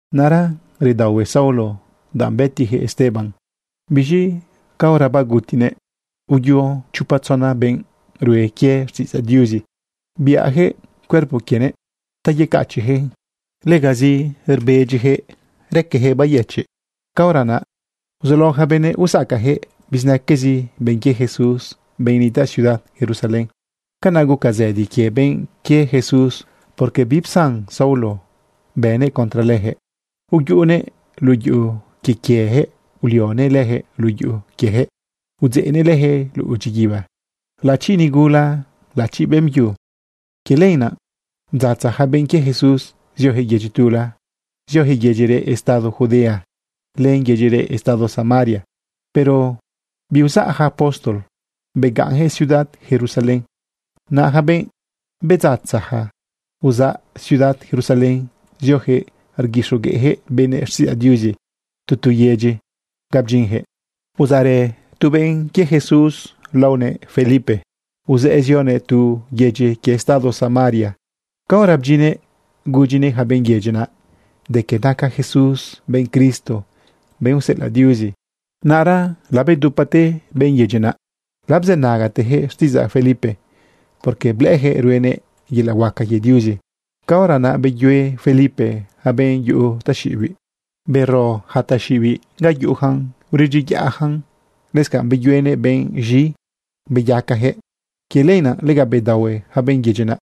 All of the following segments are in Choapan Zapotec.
Naꞌra redaohue Saulo danꞌ bëtiyaquëꞌ Esteban. Biz̃i caora bagutinëꞌ, uyo chopa tzona benꞌ rue quie xtiꞌidzaꞌ Diuzi biꞌayaquëꞌ cuerpo quienëꞌ ta yecachiꞌyaquëꞌ. Legazi rbedyiyaquëꞌ raqueyaquëꞌ bayëchiꞌ. Caora naꞌ uzulao yaca benëꞌ usacayaquëꞌ bizinaquezi benꞌ quie Jesús, benꞌ nitaꞌ ciudad Jerusalén. Canaꞌ guca zëdi quie benꞌ quie Jesús, porque bipsan Saulo bënëꞌ contra leyaquëꞌ. Uyuꞌunëꞌ luꞌu yuꞌu quie quieyaquëꞌ, ulionëꞌ leyaquëꞌ luꞌu yuꞌu quiejëꞌ udzeꞌnëꞌ leyaquëꞌ luꞌu dyiguiba, laꞌachi nigula, laꞌachi beꞌmbyu. Quie lenaꞌ bdzatza yaca benꞌ quie Jesús zioyaquëꞌ yedyi tula, zioyaquëꞌ yedyi reꞌ estado Judea len yedyi reꞌ estado Samaria. Pero biuzaꞌ yaca apóstol, begaꞌnyaquëꞌ ciudad Jerusalén. Naꞌ yaca benꞌ bedzatzaja uzaꞌ ciudad Jerusalén, zioyaquëꞌ rguixogueꞌyaquëꞌ benëꞌ xtiꞌidzaꞌ Diuzi tu tu yedyi ga bdyinyaquëꞌ. Uzaꞌrë tu benꞌ quie Jesús laonëꞌ Felipe. Uzëꞌë zionëꞌ tu yedyi quie estado Samaria. Caora bdyinnëꞌ gudyinëꞌ yaca benꞌ yedyi naꞌ de que naca Jesús benꞌ Cristo, benꞌ useꞌelaꞌ Diuzi. Naꞌra labedupate benꞌ yedyi naꞌ, labzënagateyaquëꞌ xtiꞌidzaꞌ Felipe, porque blëꞌëyaquëꞌ ruenëꞌ yelaꞌ huaca quie Diuzi. Caora naꞌ beyue Felipe yaca benꞌ yuꞌu taxiꞌibiꞌ. Bero yaca taxiꞌibiꞌ ga yuꞌuyacan uredyiyaꞌyacan. Lëscanꞌ beyuenëꞌ benꞌ z̃i, beyacayaquëꞌ. Quie lenaꞌ lega bedaohue yaca benꞌ yedyi naꞌ.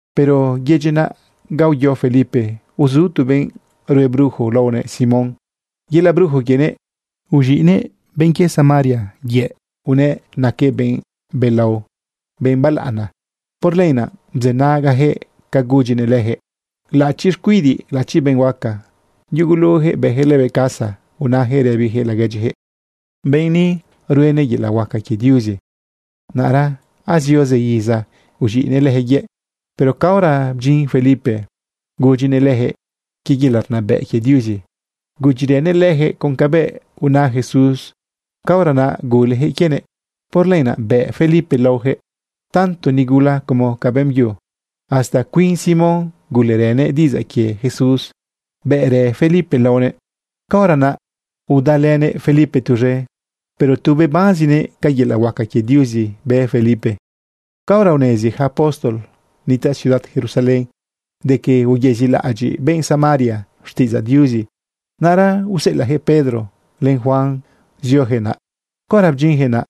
Pero yedyi naꞌ ga uyo Felipe, uzu tu benꞌ rue brujo laonëꞌ Simón. Yelaꞌ brujo quienëꞌ, uz̃iꞌnëꞌ benꞌ quie Samaria yëꞌ unëꞌ naquëꞌ benꞌ belao, benꞌ balaꞌana. Por lenaꞌ bzënagayaquëꞌ ca gudyinëꞌ leyaquëꞌ laꞌachi xcuidiꞌ, laꞌachi benꞌ huaca. Yugulujëꞌ bëyaquëꞌ lëbëꞌ caso, unayaquëꞌ rëbiyaquëꞌ laguedyiyaquëꞌ: ―Benꞌ ni ruenëꞌ yelaꞌ huaca quie Diuzi. Naꞌra azio zë iza uz̃iꞌnëꞌ leyaquëꞌ yëꞌ. Pero caora bdyin Felipe, gudyinëꞌ leyaquëꞌ quie yelaꞌ rnabëꞌ quie Diuzi, gudyirënëꞌ leyaquëꞌ con cabëꞌ una Jesús, caora naꞌ guleyaquëꞌ quienëꞌ. Por lenaꞌ bëꞌ Felipe laoyaquëꞌ, tanto nigula como ca beꞌmbyu. Hasta cuin Simón gulerënëꞌ diꞌidzaꞌ quie Jesús, bëꞌrë Felipe laonëꞌ. Caora naꞌ udalënëꞌ Felipe tuz̃e, pero tu bebanzinëꞌ ca yelaꞌ huaca quie Diuzi bë Felipe. Caora unezi ja apóstol nitaꞌ ciudad Jerusalén de que uyezilaꞌadyiꞌ benꞌ Samaria xtiꞌidzaꞌ Diuzi, naꞌra useꞌelaꞌyaquëꞌ Pedro len Juan zioyaquëꞌ naꞌ. Caora bdyinyaquëꞌ naꞌ,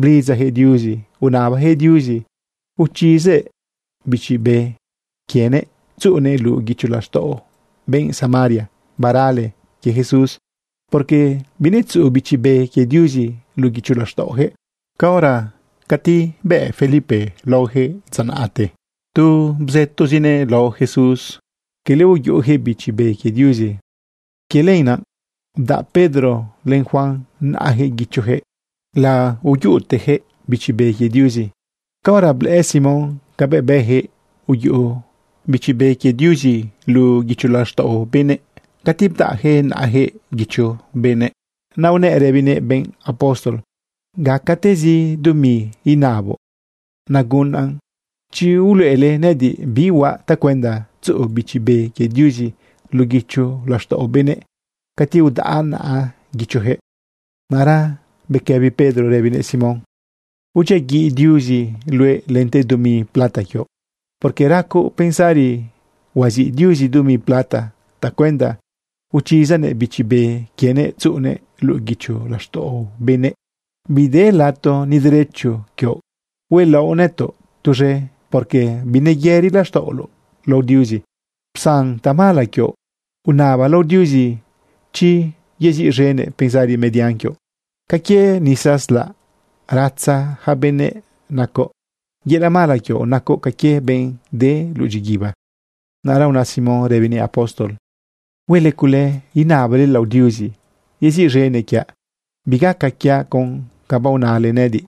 blidzayaquëꞌ Diuzi unabayaquëꞌ Diuzi uchizëꞌ Bichi Be quienëꞌ tzuꞌunëꞌ luꞌu guicho laxtaꞌo benꞌ Samaria barale quie Jesús, porque binetzuꞌu Bichi Be quie Diuzi luꞌu guicho laxtaꞌoyaquëꞌ. Caora cati bëꞌ Felipe laoyaquëꞌ dza naꞌte, tu bzëtozinëꞌ lao Jesús, quele uyuꞌuyaquëꞌ Bichi Be quie Diuzi. Quie lenaꞌ bdaꞌ Pedro len Juan naꞌayaquëꞌ guichoyaquëꞌ, laoyuꞌuteyaquëꞌ Bichi Be quie Diuzi. Caora blëꞌë Simón cabëꞌ bëyaquëꞌ uyuꞌu Bichi Be quie Diuzi luꞌu guicho laxtaꞌo benëꞌ cati bdaꞌyaquëꞌ naꞌayaquëꞌ guicho benëꞌ, naꞌ unëꞌ rëbinëꞌ benꞌ apóstol: ―Gacatezi dumi inaboꞌ nagunaꞌn, chi uluꞌele nëꞌëdiꞌ bi huaꞌ tacuenda tzuꞌu Bichi Be quie Diuzi luꞌu guicho laxtaꞌo benëꞌ cati udaꞌa naꞌa guichoyaquëꞌ. Naꞌra bequëbi Pedro rëbinëꞌ Simón: ―Udyiaguiꞌ Diuzi luëꞌ lente dumi plata quioꞌ, porque racoꞌ pensari huaziꞌ Diuzi dumi plata tacuenda uchizanëꞌ Bichi Be quienëꞌ tzuꞌunëꞌ luꞌu guicho laxtaꞌo benëꞌ. Bide lato ni derecho quioꞌ huelaoꞌ nëtoꞌ tuz̃e, porque bineyëri laxtaꞌoloꞌ lao Diuzi, psan tamala quioꞌ. Unaba lao Diuzi chi yeziꞌz̃enëꞌ pensari median quioꞌ. Ca quie nisa slaꞌ ratza ja benëꞌ nacoꞌ. Yelaꞌ mala quioꞌ nacoꞌ ca quie benꞌ de luꞌu dyiguiba. Naꞌra una Simón rëbinëꞌ apóstol: ―Huele cule inabale lao Diuzi yeziꞌz̃enëꞌ quiaꞌ, bigaca quiaꞌ con ca baonale nëꞌëdiꞌ.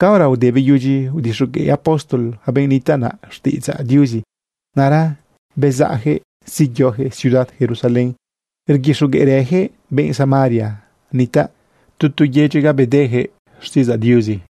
Caora ude beyudyi udixogueꞌ apóstol yaca benꞌ nitaꞌ naꞌ xtiꞌidzaꞌ Diuzi, naꞌra bezaꞌyaquëꞌ zeyoyaquëꞌ ciudad Jerusalén, rguixogueꞌrëyaquëꞌ benꞌ Samaria nitaꞌ tu tu yedyi ga bedeyaquëꞌ xtiꞌidzaꞌ Diuzi.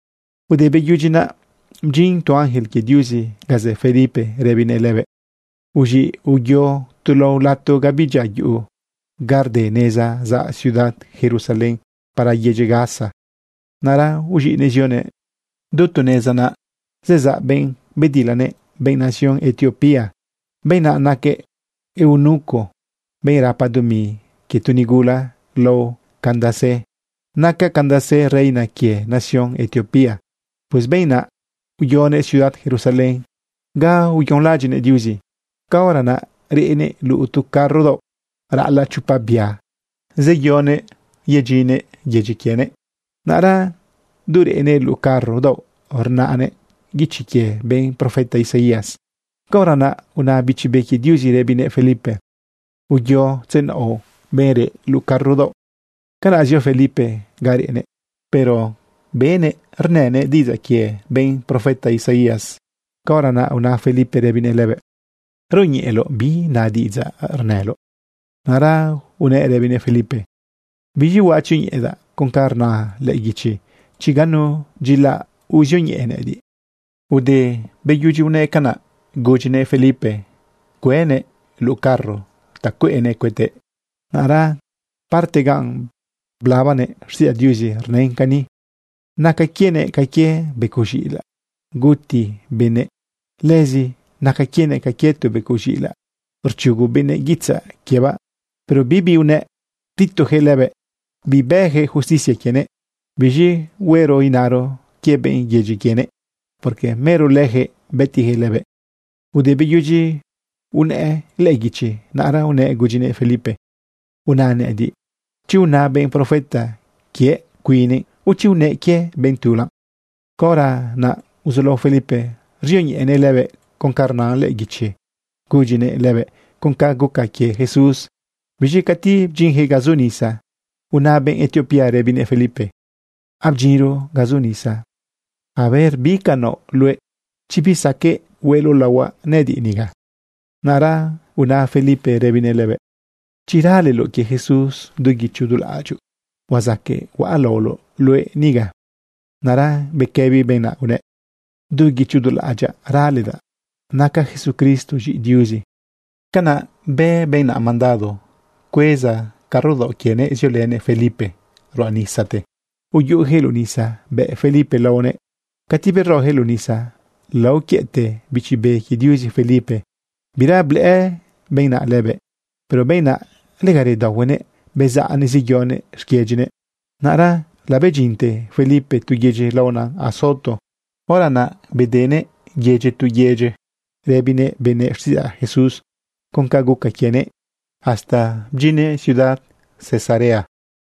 Ude beyudyi naꞌ, bdyin tu ángel quie Diuzi ga zë Felipe rëbinëꞌ lëbëꞌ: ―Uz̃iꞌ, uyo tu lao lato ga bidyia yuꞌu, ga rde neza zaꞌ ciudad Jerusalén para yedyi Gaza. Naꞌra uz̃iꞌnëꞌ zionëꞌ. Du tu neza naꞌ, zezaꞌ benꞌ bedilanëꞌ, benꞌ nación Etiopía. Benꞌ naꞌ naquëꞌ eunuco, benꞌ rapa dumi quie tu nigula lao Candace. Naca Candace reina quie nación Etiopía. Pues benꞌ naꞌ uyonëꞌ ciudad Jerusalén ga uyonlaꞌadyiꞌneꞌ Diuzi. Caora naꞌ reꞌnëꞌ luꞌu tu carro daoꞌ raꞌalaꞌ chopa bia zeyonëꞌ yedyinnëꞌ yedyi quienëꞌ. Naꞌra du reꞌnëꞌ luꞌu carro daoꞌ, rnaꞌnëꞌ guichi quie benꞌ profeta Isaías. Caora naꞌ una Bichi Be quie Diuzi rëbinëꞌ Felipe: ―Uyo tzenaoꞌ benꞌ reꞌ luꞌu carro daoꞌ. Canaꞌ zio Felipe ga reꞌnëꞌ, pero benëꞌ rnënëꞌ diꞌidzaꞌ quie benꞌ profeta Isaías. Caora naꞌ una Felipe rëbinëꞌ lëbëꞌ: ―¿Rioñeꞌeloꞌ bi na diꞌidzaꞌ rnëloꞌ? Naꞌra unëꞌ rëbinëꞌ Felipe: ―¿Biz̃i huaꞌ tzioñeꞌedaꞌ con ca rna lëꞌë guichi, chi ganu dyilaꞌ uzioñeꞌe nëꞌëdiꞌ? Ude beyudyi unëꞌ canaꞌ, gudyinëꞌ Felipe cuënëꞌ luꞌu carro ta cueꞌnëꞌ cuëtëꞌ. Naꞌra parte gan blabanëꞌ xtiꞌidzaꞌ Diuzi rnën cani: Naca quienëꞌ ca quie becoꞌ z̃iꞌilaꞌ guti benëꞌ. Lëzi naca quienëꞌ ca quie tu becoꞌ z̃iꞌilaꞌ rchugu benëꞌ guitzaꞌ quiebaꞌ, pero bibi unëꞌ. Ptitoyaquëꞌ lëbëꞌ. Bibëyaquëꞌ justicia quienëꞌ. ¿Biz̃i huero inaro quie benꞌ yedyi quienëꞌ? Porque mero leyaquëꞌ bëtiyaquëꞌ lëbëꞌ. Ude beyudyi unëꞌ lëꞌë guichi, naꞌra unëꞌ gudyinëꞌ Felipe: ―Una nëꞌëdiꞌ chi una benꞌ profeta quiëꞌ cuinnëꞌ o chi unëꞌ quie benꞌ tula. Caora naꞌ uzulao Felipe rzioñeꞌenëꞌ lëbëꞌ con ca rna lëꞌë guichi gudyinëꞌ lëbëꞌ con ca guca quie Jesús. Biz̃i cati bdyinyaquëꞌ ga zu nisa, una benꞌ Etiopía rëbinëꞌ Felipe: ―Abdyinro ga zu nisa. ¿A ver bi ca naoꞌ luëꞌ, chi bisaqueꞌ hueꞌloꞌ laohuaꞌ nëꞌëdiꞌ niga? Naꞌra una Felipe rëbinëꞌ lëbëꞌ: ―Chi raleloꞌ quie Jesús du guicho du laꞌadyoꞌ, huazaqueꞌ huaꞌ laoloꞌ luëꞌ niga. Naꞌra bequëbi benꞌ naꞌ unëꞌ: ―Du guicho du laꞌadyaꞌ raledaꞌ naca Jesucristo z̃iꞌi Diuzi. Canaꞌ bë benꞌ naꞌ mandado cueza carro daoꞌ quienëꞌ ziolënëꞌ Felipe ruꞌa nisate, uyuꞌuyaquëꞌ luꞌu nisa bëꞌ Felipe laonëꞌ lëbëꞌ. Cati beroyaquëꞌ luꞌu nisa, laoquiëꞌte Bichi Be quie Diuzi Felipe. Bira blëꞌë benꞌ naꞌ lëbëꞌ. Pero benꞌ naꞌ, lega redaohuenëꞌ bezaꞌnëꞌ zeyonëꞌ xquiedyinëꞌ. Naꞌra labedyinte Felipe tu yedyi laona Azoto. Hora naꞌ bedenëꞌ yedyi tu yedyi rëbinëꞌ benëꞌ xtiꞌidzaꞌ Jesús con ca guca quienëꞌ hasta bdyinnëꞌ ciudad Cesarea.